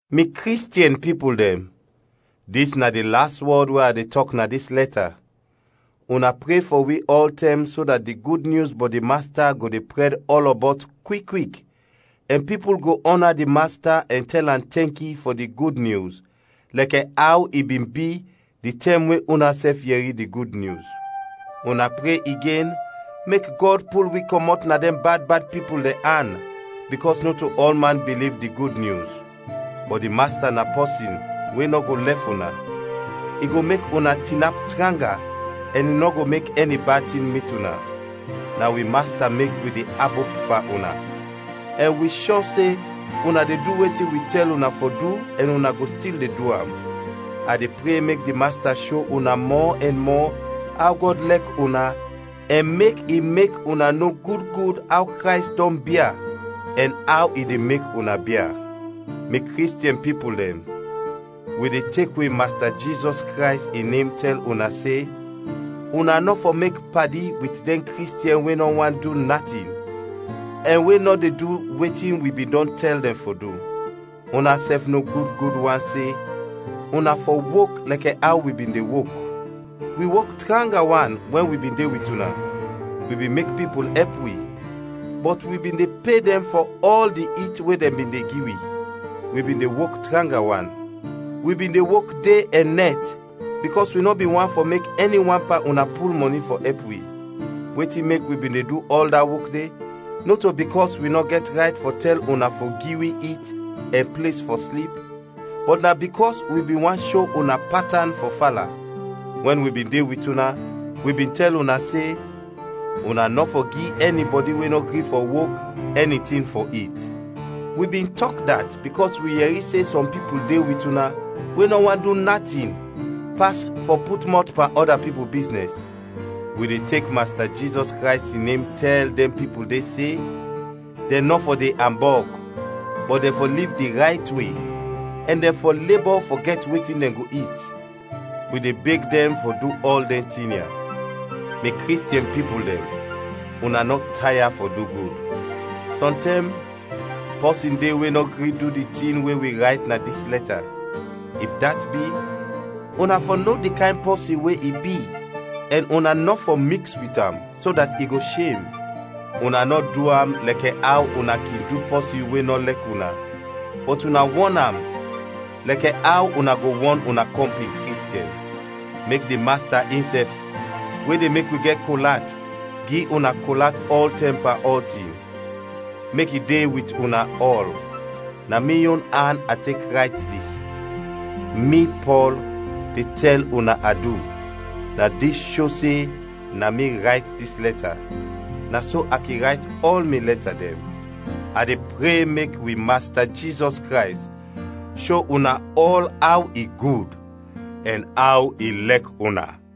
Mi Kristiɛn pipul dɛn, dis na di las wɔd we a de tɔk na dis lɛta, una pre fɔ wi ɔltɛm so dat di Gud Nyus bɔt di Masta go de prɛd ɔlɔbɔt kwik kwik ɛn pipul go ɔna di Masta ɛn tɛl am tɛnki fɔ di Gud Nyus, lɛkɛ aw i bin bi di tɛm we unasɛf yɛri di Gud Nyus. Una pre igen mek Gɔd pul wi kɔmɔt na dɛn bad bad pipul dɛn an, bikɔs nɔto ɔlman biliv di Gud Nyus. Bɔt di Masta na pɔsin we nɔ go lɛf una, i go mek una tinap tranga ɛn i nɔ go mek ɛni bad tin mit una. Na wi Masta mek wi de abop pan una, ɛn wi shɔ se una de du wetin wi tɛl una fɔ du ɛn una go stil de du am. A de pre mek di Masta sho una mɔ ɛn mɔ aw Gɔd lɛk una ɛn mek i mek una no gud gud aw Krays dɔn bia ɛn aw i de mek una bia. Mi Kristiɛn pipul dɛn, wi de tek wi Masta Jizɔs Krays in nem tɛl una se una nɔ fɔ mek padi wit dɛn Kristiɛn we nɔ want du natin, ɛn we nɔ de du wetin wi bin dɔn tɛl dɛn fɔ du. Unasɛf no gud gud wan se una fɔ wok lɛkɛ aw wi bin de wok. Wi wok tranga wan wɛn wi bin de wit una. Wi bin mek pipul ɛp wi, bɔt wi bin de pe dɛn fɔ ɔl di it we dɛn bin de gi wi. Wi bin de wok tranga wan; wi bin de wok de ɛn nɛt bikɔs wi nɔ bin want fɔ mek ɛni wan pan una pul mɔni fɔ ɛp wi. Wetin mek wi bin de du ɔl da wok de, nɔto bikɔs wi nɔ gɛt rayt fɔ tɛl una fɔ gi wi it ɛn ples fɔ slip, bɔt na bikɔs wi bin want sho una patan fɔ fala. Wɛn wi bin de wit una, wi bin de tɛl una se, “Una nɔ fɔ gi ɛnibɔdi we nɔ gri fɔ wok, ɛni tin fɔ it.” Wi bin tɔk dat bikɔs wi yɛri se sɔm pipul de wit una we nɔ want du natin pas fɔ put mɔt pan ɔda pipul biznɛs. Wi de tek Masta Jizɔs Krays in nem tɛl dɛn pipul de se: dɛn nɔ fɔ de ambɔg, bɔt dɛn fɔ liv di rayt we, ɛn dɛn fɔ lebɔ fɔ gɛt wetin dɛn go it. Wi de beg dɛn fɔ du ɔl dɛn tin ya. Mi Kristiɛn pipul dɛn, una nɔ taya fɔ du gud. Sɔntɛm, pɔsin de we nɔ gri du di tin we wi rayt na dis lɛta. If dat bi, una fɔ no di kayn pɔsin we i bi ɛn una nɔ fɔ miks wit am, so dat i go shem. Una nɔ du am lɛkɛ aw una kin du pɔsin we nɔ lɛk una, bɔt una wɔn am lɛkɛ aw una go wɔn una kɔmpin Kristiɛn. Mek di Masta insɛf, we de mek wi gɛt kol at, gi una kol at ɔltɛm pan ɔltin. Mek i de wit una ɔl. Na mi yon an a tek rayt dis: Mi, Pɔl, de tɛl una adu. Na dis sho se na mi rayt dis lɛta; na so a kin rayt ɔl mi lɛta dɛn. A de pre mek wi Masta Jizɔs Krays sho una ɔl aw i gud ɛn aw i lɛk una.